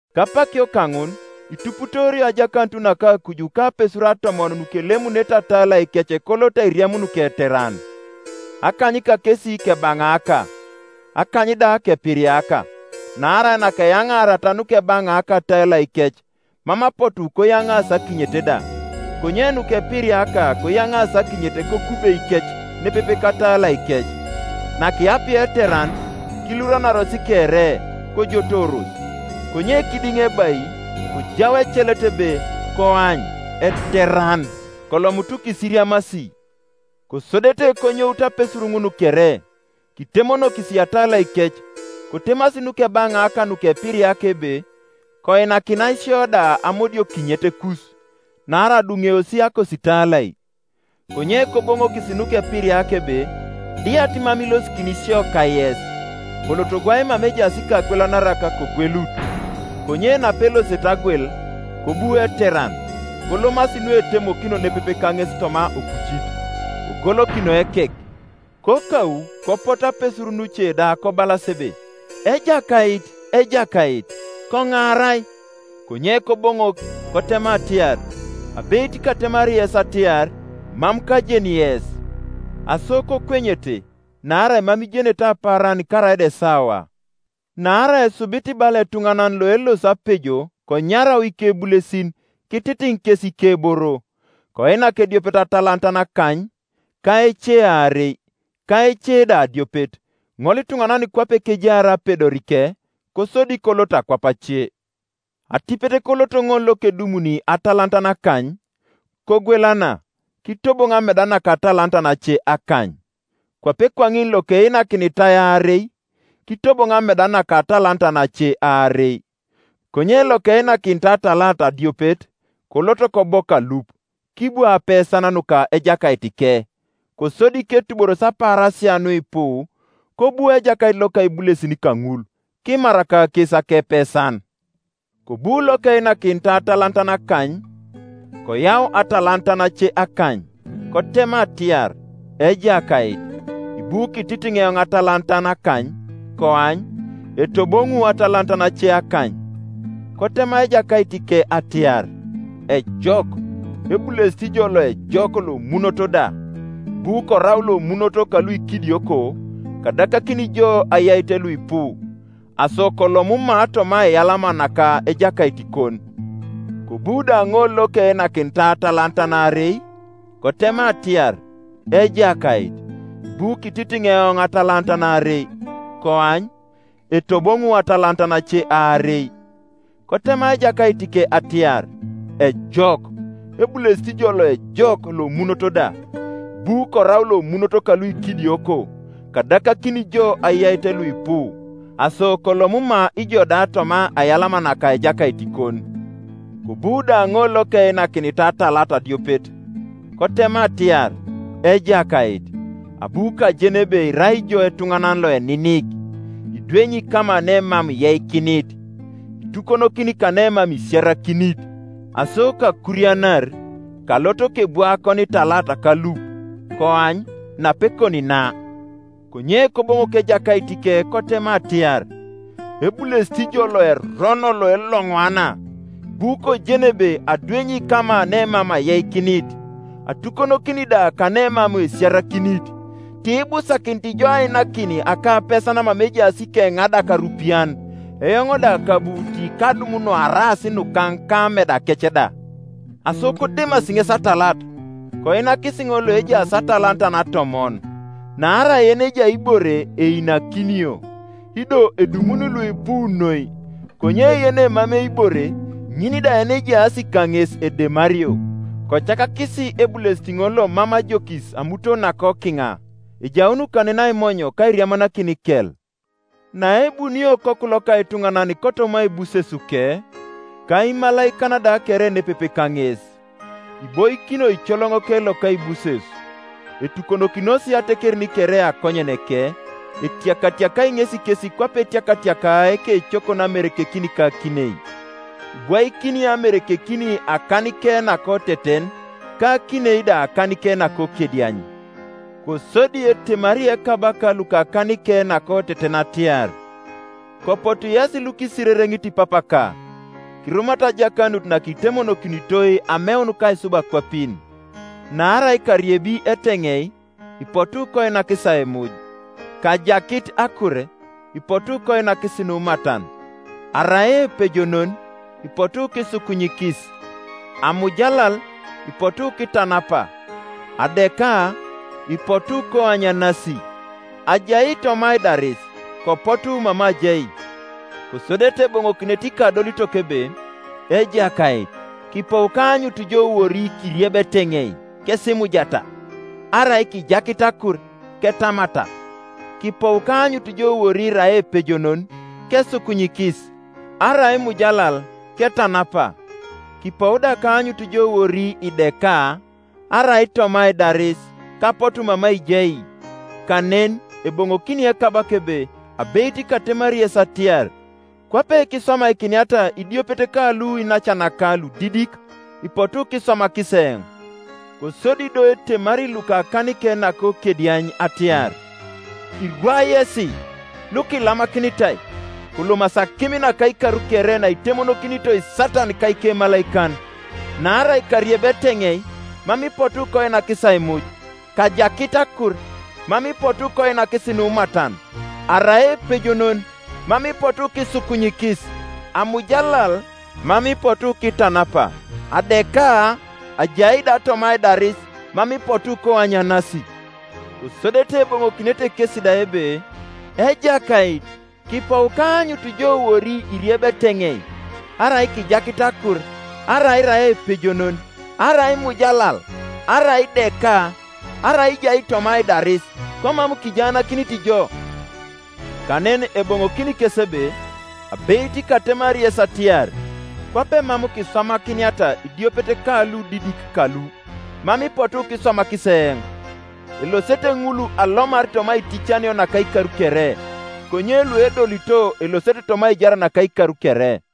“Kapakio kaŋun ituputoorio ajakanut naka akuj kapesuru atomon nukelemunete atalaikec koloto airiamun keteran. Akany kakes kebanaaka, akany da kepiriaka. Naarai nakeyaŋaariata nukebaŋaaka atalaikec, mam apotu koyaŋaasi akinyet da; Konye nukepiriaka koyaŋaasi akinyet kokubeikec nepepe katalaikec. Nakiyapia eteran, kiluranaros kere, kojotooros. Konye kidiŋebai kojau ecelet ebe, ‘Koany, eteran! Kolomutu kisiriamasi.’ Kosodete konyout apesur ŋun kere, kitemonokis atalaikec. Kotemasi nukebaŋaaka nukepiriaka ebe, ‘Koinakinai sio da amodiokinyetekus, naarai aduŋeosi akositalai.’ Konye koboŋokis nukepiriaka ebe, ‘Diat mam ilosikin sio kayes; koloto gwai mama ejaas ikagwelanarak kogwelut.’ Konye napelosete agwel, kobu eteran, kolomasi nuetemokino nepepe kaŋes toma opucit; kogolokinoi ekek. Kokau kopotu apesur nuce da kobalas ebe, ‘Ejakait, ejakait, koŋaarai.’ Konye Koboŋok, kotema atiar, ‘Abeit katemari yes atiar, mam kajeni yes.’ Aso kokwenyete, naarai mam ijenete apaaran karaida esawa. “Naarai esubit bala etuŋanan loelosi apejo konyarau ikebulesin, kititiŋ kes ikeboro. Koinak ediopet atalatan akany, ka ece aarei, ka ece da adiopet, ŋolituŋanan kwape kejaar apedorike; kosodi kolot akwap ace. Atipet kolot ŋol lokedumuni atalatan akany, kogwelana, kitobon ameda naka atalatan ace akany. Kwape kwaŋin lokeinakinitai aarei, kitobon ameda naka atalatan ace aarei. Konye lokeinakinitai atalat adiopet, kolot kobok alup, kibwa apesan nuka ejakaitike. Kosodi ketuboros apaarasia nuipu, kobu ejakait loka ibulesin kaŋul, kimar kakes akepesan. Kobu lokeinakinitai atalatan akany, koyau atalatan ace akany, kotema atiar, ‘Ejakait, ibu kititiŋ eoŋ atalatan akany; koany, etoboŋu atalatan ace akany.’ Kotema ejakaitike atiar, ‘Ejok, ebulesit ijo loejok lomunot da; ibu korau lomunot kaluikidioko, kadakakini jo ayait luipu; aso kolom ma toma aiyalama naka ejakaitikon.’ Kobu da ŋol lokeinakinitai atalatan aarei, kotema atiar, ‘Ejakait, ibu kititiŋ eoŋ atalatan aarei; koany, etoboŋu atalatan ace aarei.’ Kotema ejakaitike atiar, ‘Ejok, ebulesit ijo loejok lomunot da; ibu korau lomunot kaluikidioko, kadakakini jo ayait luipu; aso kolom ma ijo da toma aiyalama naka ejakaitikon.’ Kobu da ŋol lokeinakinitai atalat adiopet, kotema atiar, ‘Ejakait, abu kajen ebe irai ijo etuŋanan loeninik, idwenyi kama nemam iyeikinit, itukonokini kanemam isiarakinit; aso kakurianar, kalot kebwa akonitalat kalup: koany, napekon na.’ Konye Koboŋok ejakaitike kotema atiar, ‘Ebulesit ijo loerono loeloŋwana! Ibu kojen ebe adwenyi kama nemam ayeikinit, atukonokini da kanemam esiarakinit; ti ibusakinit ijo ainakin akapesan mama ejaas ikeŋadak arupian, eoŋ da kabu tikadum nuaraas nukaŋ ka amedakec da. Aso kodemasi ŋes atalat, koinakis ŋol loejaas atalatan atomon. Naarai yenejai ibore einakinio, ido edumuni luipu noi; konye yenemamei ibore, ŋin da yenejaas kaŋes edemario. Kocakakisi ebulesit ŋol lomam ajokis amuton nakokiŋa: ejaun kanen aimony ka airiamanakin ikel.’ “Naebunio Okoku loka etuŋanan kotoma aibusesuke, ka imalaikan da kere nepepe kaŋes, iboikini oicoloŋoke loka aibuses; etukonokinos atekerin kere akonyeneke, etiakatiakai ŋesi kes kwape etiakatiakaa ekecokon amerekekin ka akinei: ibwaikini amerekekin akanike nakoteten ka akinei da akanike nakokediany. Kosodi etemari ekabaka lukakanike nakoteten atiar, ‘Kopotu yesi lukisirereŋit Papaka, kirumata ajakanut nakitemonokinitoi ameun kaisub akwapin; naarai kariebi eteŋei, ipotu koinakis aimuj, kajakit akur, ipotu koinakis numatan; arai epejonon, ipotu kisukunyikis; amujalal, ipotu kitanapa; adeka, ipotu koanyanasi; ajai toma aidaris, kopotu mama ajai.’ Kosodete eboŋokinete ikadolitok ebe, ‘Ejakait, kipou kaanyutu jo wori kiriebi eteŋei, kesimujata? Arai kijakit akur, ketamata? Kipou kaanyut jo wori irai epejonon, kesukunyikis? Arai imujalal, ketanapa? Kipou da kaanyutu jo wori ideka, arai toma aidaris, kapotu mama ijai?’ Kanen eboŋokini ekabaka ebe, ‘Abeit katemari yes atiar, Kwape kiswamakiniata idiopet kalu iinacanaka ludidik, ipotu kiswamakis eoŋ.’ Kosodi do etemari lukakanike nakokediany atiar, ‘Irwa yesi, lukilamakinitai, kolomasi akim naka ikar kere naitemokinitoi Satan ka ikemalaikan. Naarai kariebi eteŋei, mam ipotu koinakis aimuj; kajakit akur, mam ipotu koinakis numatan; arai epejonon, mam ipotu kisukunyikis; amujalal, mam ipotu kitanapa; adeka, ajai da toma aidaris, mam ipotu koanyanasi.’ Kosodete eboŋokinete kesi da ebe, ‘Ejakait, kipou kaanyutu jo wori iriebi eteŋei, arai kijakit akur, arai irai epejonon, arai imujalal, arai ideka, arai ijai toma aidaris, komam kijaanakinit jo?’ Kanen eboŋokini kes ebe, ‘Abeit katemari yes atiar, Kwape mam kiswamakiniata idiopet kaludidik kalu, mam ipotu kiswamakis eoŋ.’ Elosete ŋul alomar toma aiticanio naka ikar kere, konye luedolito elosete toma aijar naka ikar kere.”